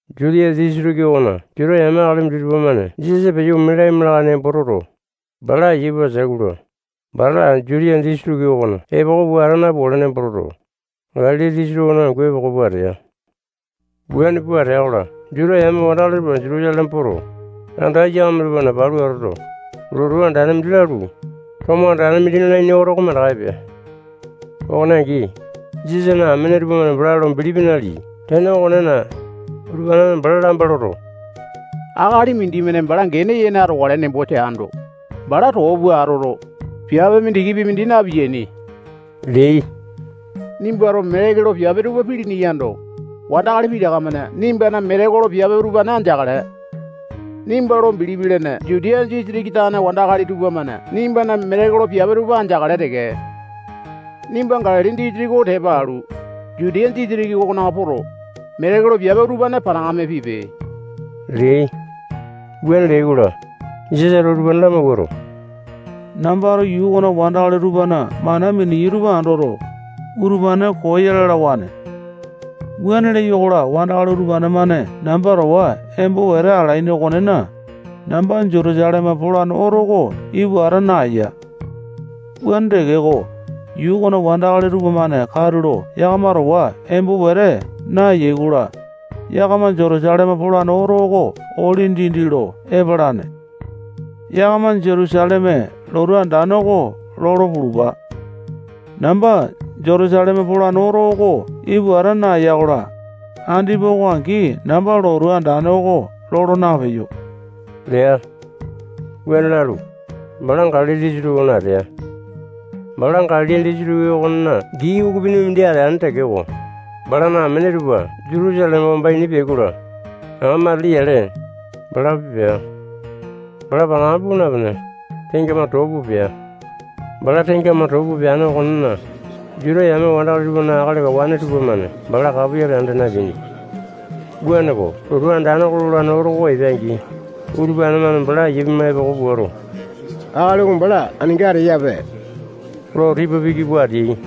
Jutiya disitiki okona Juta yame akali minditupa-mane Jisasa peyo ome laima lakae lo nembo toto, bala aiya pua ateai-kola, bala Jutiya disitiki okona epoko pua ata napukale nembo toto, Galili disitiki okona angu epoko pua atea. Wuane pua atea-kola, Juta yame wandakali tupa Jutusaleme poto, anda aiyakame tupana palu atoto, lotu andane mindi lalu, tomo andane mindi nalaini oto oko mandaka epea. Okone angi, Jisasana amene tupamane bala lo bilipi naleai. Tene okonena, utupane-mane bala lamba loto, akali mindimane bala gene yene atokale nembo teando, bala too pua atoto, piape mindikipi mindi na-piyaini leai. Nimbato metekolo piape tupa pilini yando, wandakali pitaka-mane nimbana metekolo piape utupane andeakale. Nimba lo bilipi lene Jutiya disitiki tane wandakali tupamane nimbana metekolo piape tupa andeakale teke. Nimba Galili disitiki oko tepa alu, Jutiya disitiki okona poto, metekolo piape utupane panakame pipe leai. Wuane leai-kola, Jisasato utupane lamawuato, nambato yuu okona wandakali tupana mana miniyai tupa andoto, utupane koo ya lalawane. Wuane leyo-kola, wandakali utupane-mane namba towa embo wete alaini okonena, namba Jutusaleme polane oto oko ipu ata naeya. Wuane tekeko, yuu okona wandakali tupamane katulo yakama towa embo wete naeyai-kola, yakama Jutusaleme polane oto oko ole dindi lo epalane. Yakama Jutusaleme lotu andane oko lolo pulupa. Namba Jutusaleme polane oto oko ipu ata naeya-kola, andipa oko angi namba lotu andane oko lolo napeyo lea. Wuane lalu, bala Galili disitiki okona atea. Bala Galili disitiki okona gii ukupini mindi ateane tekeko, balana amene tupa Jutusaleme wamba ini peai-kola, aŋa matili yale, balapi pea. Bala panakame puu napene, tengamane too pua pea. Bala tengamane too pua peane okonena, Juta yame wandakali tupana akali kawane tupamane bala kapoyale anda napeainipia. Wuaneko, lotu andane lolane oto oko epea-angi, utupane-mane bala aiya pima epoko puato, akali oko bala aninga ateyape lo tipa piki pua ateai.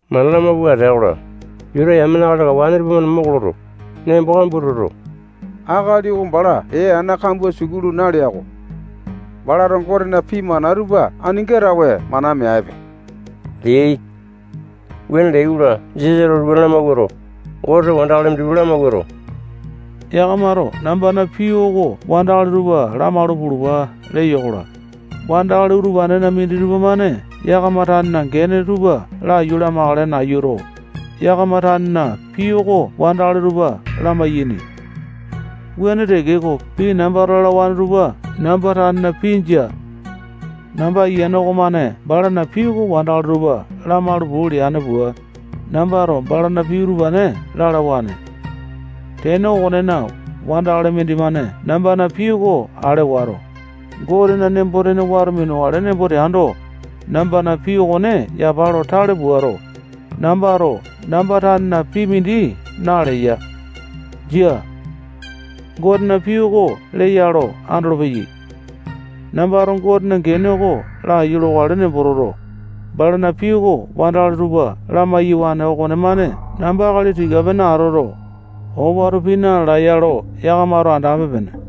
Mana lamauwa atea-kola, Juta yamena akali kawane tupamane moko loto, nembo kambua toto, akali oko bala ee ana kambua sukulu nalea-ko. Balato Gotena pii mana tupa aninga tawe mana meape leai. Wuane leai-kola, Jisasato utupane lamawuato, Goteto wandakali minditupa lamawuato, yakamato nambana pii oko wandakali tupa lamalu pulupa leya-kola, wandakali utupanena minditupa-mane yakama tanena gene tupa laiyu lamakale nayuto, yakama tanena pii oko wandakali tupa lamai-yaini. Wuane tekeko, pii nambato lalawane tupa namba tanena pii jia. Namba Ayiane okomane balana pii oko wandakali tupa lamalu puu leane pua, nambato balana pii utupane lalawane. Tene okonena, wandakali mindimane nambana pii oko ale wato, Gotena nembo-tene wato minukale nembo teando, nambana pii okone yapa lo tale puato, nambato namba tanena pii mindi naleya. Jia. Gotena pii oko leya lo andolopeyai. Nambato Gotena gene oko laiyu lokale nembo toto, balana pii oko wandakali tupa lamai-yawane okomane namba akali tika-pene atoto, owato pii na-lalae ya lo yakamato andape-pene.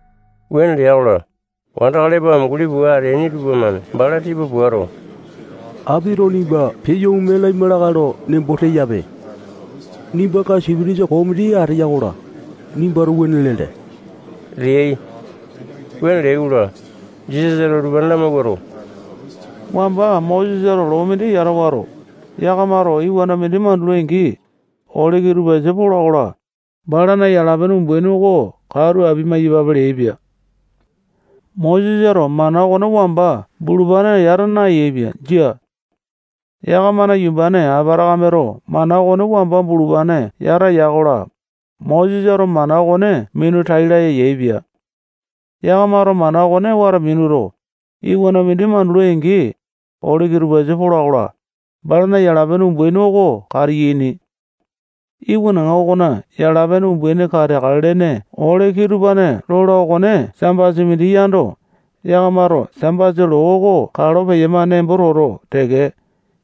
Wuane lea-kola, wandakali epo amunguli pua ateaini tupamane bala tipa puato, apito nimba peyo ome laima lakae lo nembo teyape. Nimbanga sipitisa koo mindi ateya-kola, nimbato wuane lele leai. Wuane leai-kola, Jisasato utupane lamawuato, wamba Mosesato loo mindi yata wato, yakamato iwana mindi mandulai-angi, ole kitupasa pola-kola, balana yala-pene umbaini oko katu apia-maiyapape leaipia. Mosesato mana okone wamba bulupane yata nayaepia. Jia. Yakamana yumbane Apatakameto mana okone wamba bulupane yata ya-kola, Mosesato mana okone minu tai laya yaepia. Yakamato mana okone wato minuto, iwana mindi mandulai-angi, ole kitupasa pola-kola, balana yala-pene umbaini oko katiyaini. Iwanaŋa okona yala-pene umbaini kateakale lene ole kitupane lola okone Sambasa mindi yando, yakamato Sambasa loo oko kalo peyama nembo toto teke,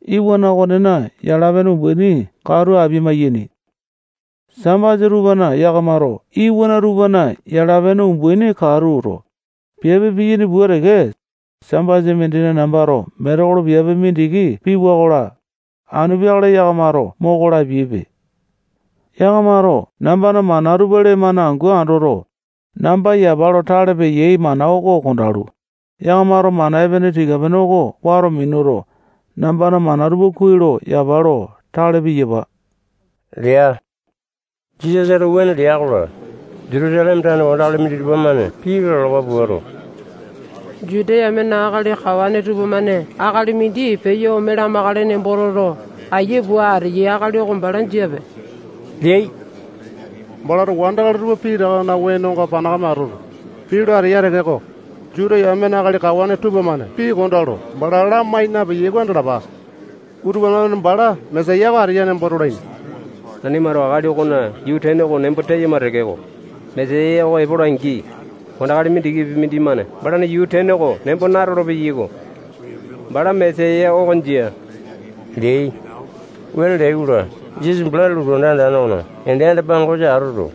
iwana okonena yala-pene umbaini katu apia-maiyaini. Sambasa tupana yakamato iwana tupana yala-pene umbaini katuto, piape piyaini pua teke, Sambasa mindina nambato metekolo piape mindiki piwa-kola, anu peakale yakamato moko lapiaipe. Yakamato nambana mana tupa lee-mane angu andoto, namba yapa lo tale peyai mana oko kondalu, yakamato mana epene tika-pene oko wato minuto, nambana mana tupa kuai lo yapa lo tale piyapa lea. Jisasato wuane lea-kola, Jutusaleme tane wandakali minditupa-mane pii lalawa puato, Juta yamena akali kawane tupamane akali mindi peyo ome lamakale nembo toto, aiya pua ateyai akali oko bala jiape leai. Balato wandakali tupa pitakana wenonga panakame atoto, pii lo ateya tekeko, Juta yamena akali kawane tupamane pii kondaa lo bala lamai napeyai oko andalapa. Utupane-mane bala Mesaya oko ateya nembo tolaini. Nanimato akali okona yuu tene oko nembo teyama tekeko, Mesaya oko epola-angi, wandakali mindikipi mindimane balana yuu tene oko nembo natolo-peyaiko. Bala Mesaya oko jia leai. Wuane leai-kola, Jisasa bala lotu anda andane okona ende anda-pangosa atoto,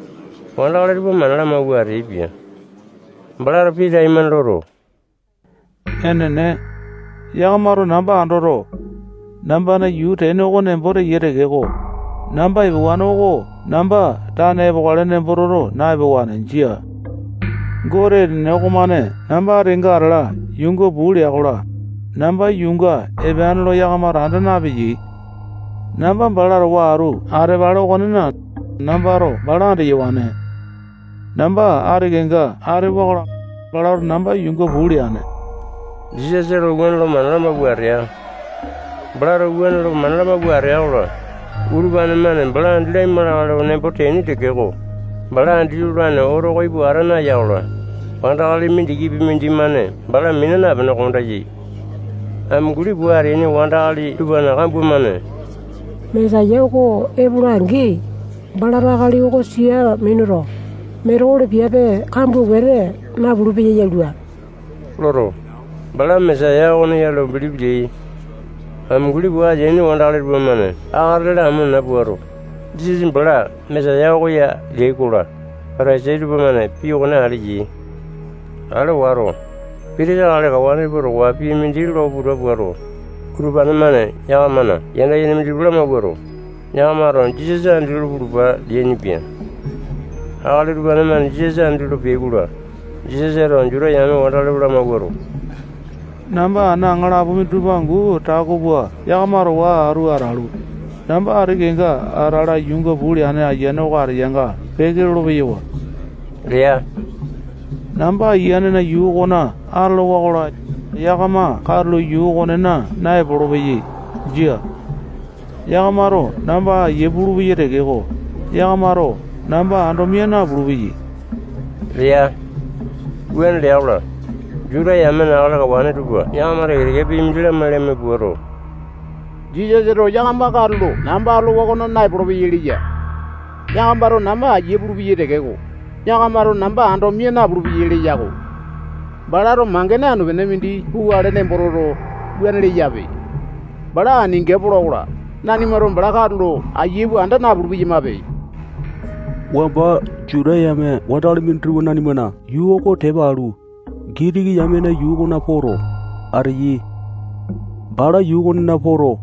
wandakali tupa mana lamawua ateaipia. Balato pii taimane loto, enene, yakamato namba andoto, nambana yuu tene oko nembo teyai tekeko, namba epewane oko namba tane epokale nembo toto na-epewane. Jia. Gote enene okomane namba ati kenga atala yuunga puu lea-kola, namba yuunga epeane lo yakamato anda napeyai. Namba bala towa atu atapale okonena, nambato bala andeyawane. Namba ati kenga atewa-kola, balato namba yuunga puu leane. Jisasato wuane lo mana lamawua atea. Balato wuane lo mana lamawua atea-kola, utupane-mane bala andi laima lakae lo nembo teaini tekeko, bala andi lolane oto oko ipu ata naya-kola, wandakali mindikipi mindimane bala mina napene, kondayai. Amunguli pua ateaini wandakali tupana kambua-mane Mesaya oko epola-angi, balato akali oko sia minuto, metekolo piape kambua wete napulu-peya yalua loto, bala Mesaya okone ya lo bilipi leai. Amunguli pua ateaini wandakali tupamane akatete lamo nena puato, Jisasa bala Mesaya oko ya leai-kola, Patasai tupamane pii okone ale yai. Ale wato, pitisa akali kawane tupa towa pii mindi lo puta puato, utupane-mane yakamana yanda yene minditupa lamawuato, yakamato Jisasa andi lolo pulupa leainipia. Akali utupane-mane Jisasa andi lolo peai-kola, Jisasato Juta yame wandakali tupa lamawuato, namba ana aŋalapo minditupa angu tako pua yakama towa atu atalu, namba ati kenga atala yuunga puu leane Ayiane oko ateyanga peke lolo-peyawa lea. Namba Ayianena yuu okona atolowa-kola, yakama katulo yuu okonena naepolo-peyai. Jia. Yakamato namba aiya pulupeyai tekeko, yakamato namba ando mia napulu-peyai lea. Wuane lea-kola, Juta yamena akali kawane tupa yakama teke-teke pii mindi lamai-lamai puato, Jisasato yakama katulo namba atolowa okona naepolo-peyai leya. Yakamato namba aiyu pulupeyai tekeko, yakamato namba ando mia napulu-peyai leya-ko. Balato mangene anu-pene mindi pukale nembo toto, wuane leyape. Bala aninga pola-kola, nanimato bala katulo aiya pua anda napulu-peyamape. Wamba Juta yame wandakali minditupa nanimana yuu oko tepa alu, Gitiki yamena yuu okona poto, ateyai. Bala yuu okonena poto,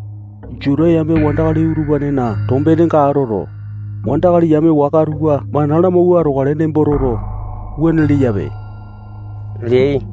Juta yame wandakali utupanena tombenenga atoto, wandakali yame waka tupa mana lamauwa atokale nembo toto, wuane leyape leai.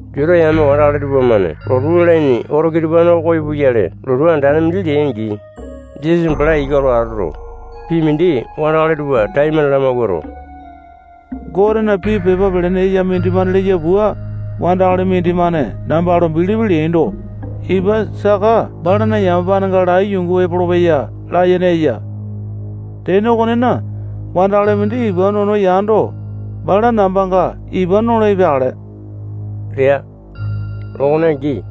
Juta yame wandakali tupamane lotu lalaini oto kitupane koyo puyale lotu andane mindi leai-angi, Jisasa bala ika lo atoto, pii mindi wandakali tupa taimane lamawuato, Gotena pii pepa pelene eya mindimane leya pua, wandakali mindimane namba lo bilipi leaindo, ipa saka balana yamapanenga lai yungu epolopeya layene eya. Tene okonena, wandakali mindi ipa nono yando, bala nambanga ipa nolo epeakale lea. Okone angi,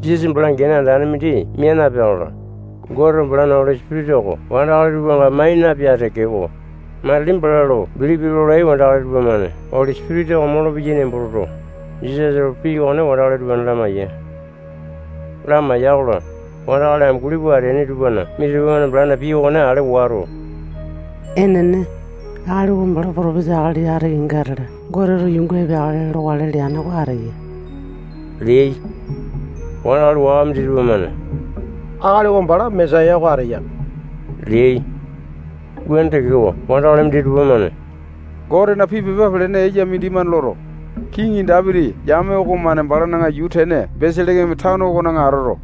Jisasa bala gene andane mindi mia napea-kola, Goteto balana Oli Sipitisa oko wandakali tupanga mai na-epea tekeko, matili bala lo bilipi lolai wandakali tupamane Oli Sipitisa oko molopeyai nembo toto, Jisasato pii okone wandakali utupane lamaiya. Lamaiya-kola, wandakali amunguli pua ateaini tupana minditupa-mane balana pii okone ale wato, enene, akali oko bala potopisa akali ati kenga atala Goteto yuunga epeakale lokale leane oko ateya leai. Wandakali waka minditupa-mane akali oko bala Mesaya oko ateya leai. Wuane tekeko, wandakali minditupa-mane Gotena pii pepa pelene eya mindimane loto, kiŋi Dapiti yame okomane balana yuu tene Beselekeme tano okona atoto,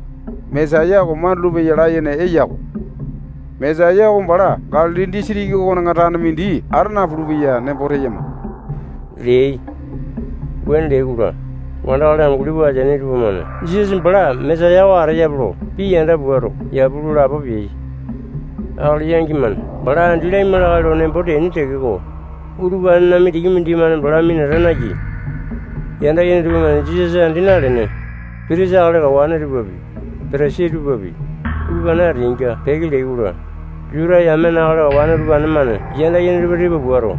Mesaya oko mandulu-peya layene eya-ko. Mesaya oko bala Galili disitiki okona tane mindi ata napulu-peya nembo teyama leai. Wuane leai-kola, wandakali amunguli pua ateaini tupamane Jisasa bala Mesaya oko ateyape lo pii yanda puato, yapu lo lapo peai. Akali yangi-mane bala andi laima lakae lo nembo teaini tekeko, utupanena mindikipi mindimane bala minata nayai. Yanda yene tupamane Jisasa andi nalene, pitisa akali kawane tupapi, Patasai tupapi, utupane ateainga peke leai-kola, Juta yamena akali kawane utupane-mane yanda yene tupa tipa puato,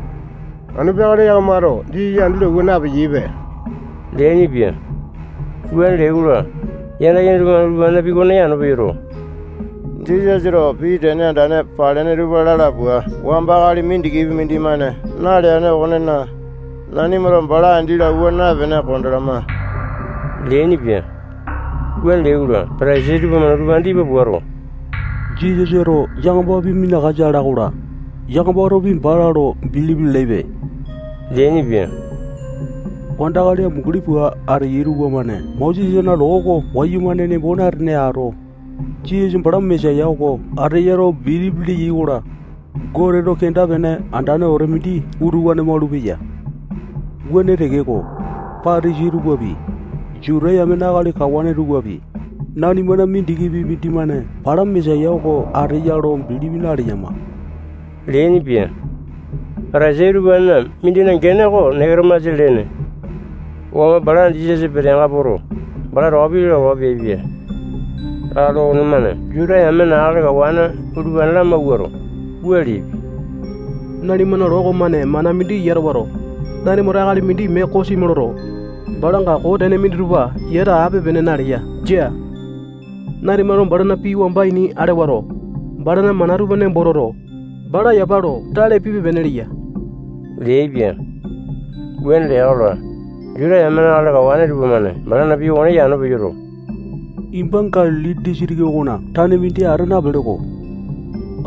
anu peakale yakamato Jisasa andi lo awua na-epeyaipe leainipia. Wuane leai-kola, yanda yene tupamane utupanena pii okone yano peyoto, Jisasato pii tene andane palene tupa lala pua wamba akali mindikipi mindimane naleane okonena, nanimato bala andi lo awua naepene kondalama leainipia. Wuane leai-kola, Patasai tupamane utupane tipa puato, Jisasato yakamapi minakasa ala-kola, yakamatopi bala lo bilipi lalaipe leainipia. Wandakali amunguli pua ateyai tupamane Mosesana loo oko wayumane nembo natene ato, Jisasa bala Mesaya oko ateya lo bilipi leyai-kola, Goteto kenda-pene andane wete mindi utupane malupeya. Wuane tekeko, Patasai tupapi, Juta yamena akali kawane tupapi, nanimana mindikipi mindimane bala Mesaya oko ateya lo bilipi naleyama leainipia. Patasai utupane mindina gene oko Neketomasa lene. Wamba bala Jisasa peteanga poto, bala towa pii lalawa peaipia. Akali okonemane Juta yamena akali kawane utupane lamawuato, wua leaipia. Nanimana loo okomane mana mindi yata wato, nanimato akali mindi mee kosimi loto, balanga koo tene minditupa yata ape-pene naleya. Jia. Nanimato balana pii wamba ini ale wato, balana mana tupa nembo toto, bala yapa lo tale pipe-pene leya leaipia. Wuane lea-kola, Juta yamena akali kawane tupamane balana pii okone yano peyoto, nimba Galili disitiki okona tane mindi ata napele-ko.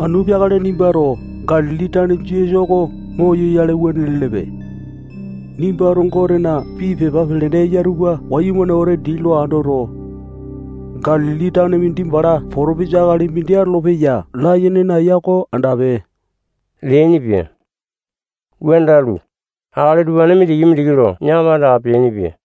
Anu peakale nimbato Galili tane Jisasa oko moyoyale wuane lelepe. Nimbato Gotena pii pepa pelene eya tupa wayumane wete dii lo andoto, Galili tane mindi bala potopisa akali mindi atolopeya layene naeya oko andape leainipia. [Wuane lalu, akali utupane mindiki-mindiki lo yakama andaka peainipia.]